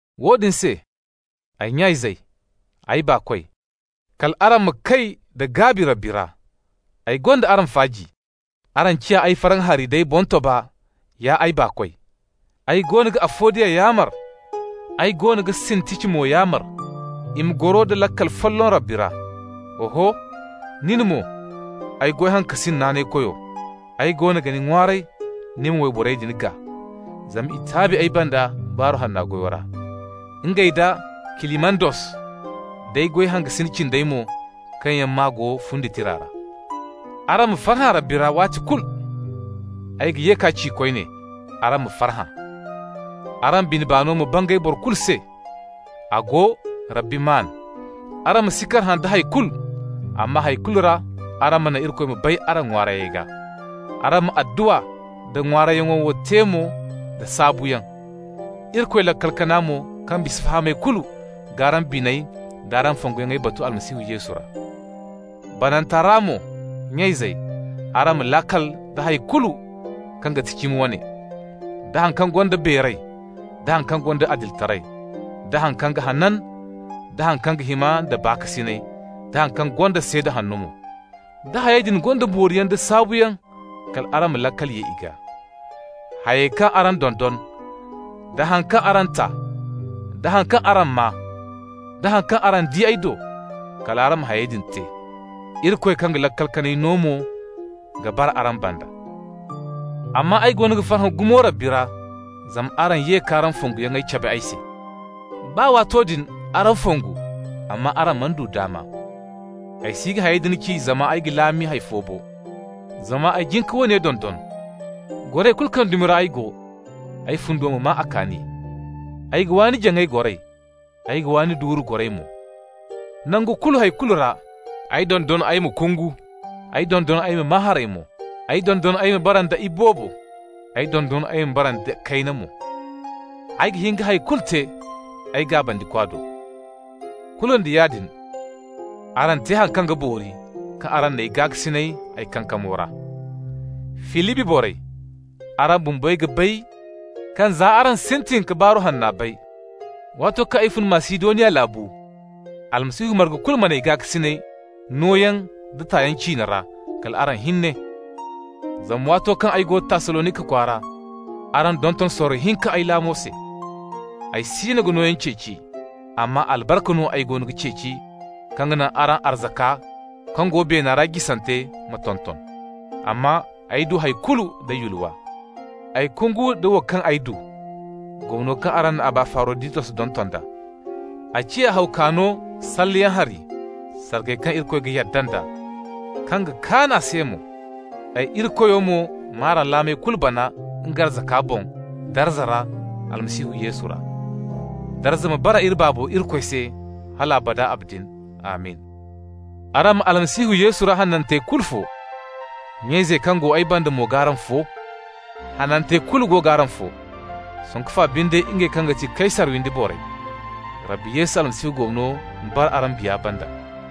Woodin se, ay nya-izey, ay baakoy, kal araŋ ma kay da gaabi Rabbi ra. Ay gonda araŋ faaji. Araŋ ciya ay farhã hari d'ay boŋtoba, ya ay baakoy. Ay goono ga Afodiya yaamar, ay goono ga Sintici mo yaamar, i ma goro da laakal folloŋ Rabbi ra. Oho, nin mo, ay goy hangasin naanaykoyo, ay goono ga ni ŋwaaray ni ma wayborey din gaa. Zama i taabi ay banda Baaru Hanna goyo ra, ngey nda Kilimandos, d'ay goy hangasin cindey mo kaŋ yaŋ maa go fundi tira ra. Araŋ ma farhã Rabbi ra waati kulu! Ay ga ye k'a ci koyne: araŋ ma farhã! Araŋ bine-baano ma bangay boro kulu se. A go, Rabbi maan. Araŋ ma si karhã da hay kulu, amma hay kulu ra araŋ ma naŋ Irikoy ma bay araŋ ŋwaarayyaŋey gaa. Araŋ ma adduwa nda ŋwaarayyaŋo wo te mo da saabuyaŋ. Irikoy laakal kana mo, kaŋ bisa fahamay kulu g'araŋ biney d'araŋ fonguyaŋey batu Almasihu Yesu ra. Bananta ra mo, nya-izey, araŋ ma laakal da hay kulu kaŋ ga ti cimi wane, da haŋ kaŋ gonda beeray, da haŋ kaŋ gonda adilitaray, da haŋ kaŋ ga hanan, da haŋ kaŋ hima nda baakasinay, da haŋ kaŋ gonda seeda hanno mo. Da hayey din gonda booriyaŋ wala saabuyaŋ, kal araŋ ma laakal ye i gaa. Hayey kaŋ araŋ dondon, da haŋ kaŋ araŋ ta, da haŋ kaŋ araŋ maa, da haŋ kaŋ araŋ di ay do, kal araŋ ma hayey din te. Irikoy kaŋ ga laakal kanay no mo ga bara araŋ banda. Amma ay goono ga farhã gumo Rabbi ra zama araŋ ye k'araŋ fonguyaŋ cabe ay se. Baa waato din araŋ fongu, amma araŋ mana du daama. Ay si ga hayey din ci zama ay ga laami hay fo bo, zama ay jin ka woone dondon: goray kulu kaŋ dumi ra ay go, ay fundo ma maa a kaani. Ay ga waani jaŋay goray, ay ga waani duure goray mo. Nangu kulu hay kulu ra ay dondon ay ma kungu, ay dondon ay ma maa haray mo. Ay dondon ay ma bara nda iboobo, ay dondon ay ma bara nda kayna mo. Ay ga hin ka hay kulu te ay Gaabandikwa do. Kulu nda yaadin, araŋ te haŋ kaŋ ga boori kaŋ araŋ n'ay gaakasinay ay kankamo ra. Filibi borey, araŋ bumbey ga bay kaŋ za araŋ sintin ka Baaru Hanna bay, waato kaŋ ay fun Masidoniya laabu, Almasihu marga kulu man'ay gaakasinay nooyaŋ da tayaŋ ciine ra kala araŋ hinne. Zama waato kaŋ ay go Tassalonika kwaara, araŋ donton sorro hinka ay laamo se. Ay siino ga nooyaŋ ceeci, amma albarka no ay goono ga ceeci kaŋ ga naŋ araŋ arzaka kaŋ go beena ra jisante ma tonton. Amma ay du hay kulu nda yulwa. Ay kungu nda wo kaŋ ay du, gomno kaŋ araŋ na Abafaroditos donton d'a. A ciya haw kaano salleyaŋ hari, sargay kaŋ Irikoy ga yadda nd'a, kaŋ ga kaan a se mo. Ay Irikoyo mo g'araŋ laamey kulu bana nga arzaka boŋ darza ra, Almasihu Yesu ra. Darza ma bara iri Baabo Irikoy se hal abada abadin! Amin. Araŋ ma Almasihu Yesu ra hanantey kulu fo. Nya-izey kaŋ go ay banda mo g'araŋ fo. Hanantey kulu go g'araŋ fo, sanku fa binde ngey kaŋ ga ti Kaysar windi waney. Rabbi Yesu Almasihu gomno ma bara araŋ biya banda.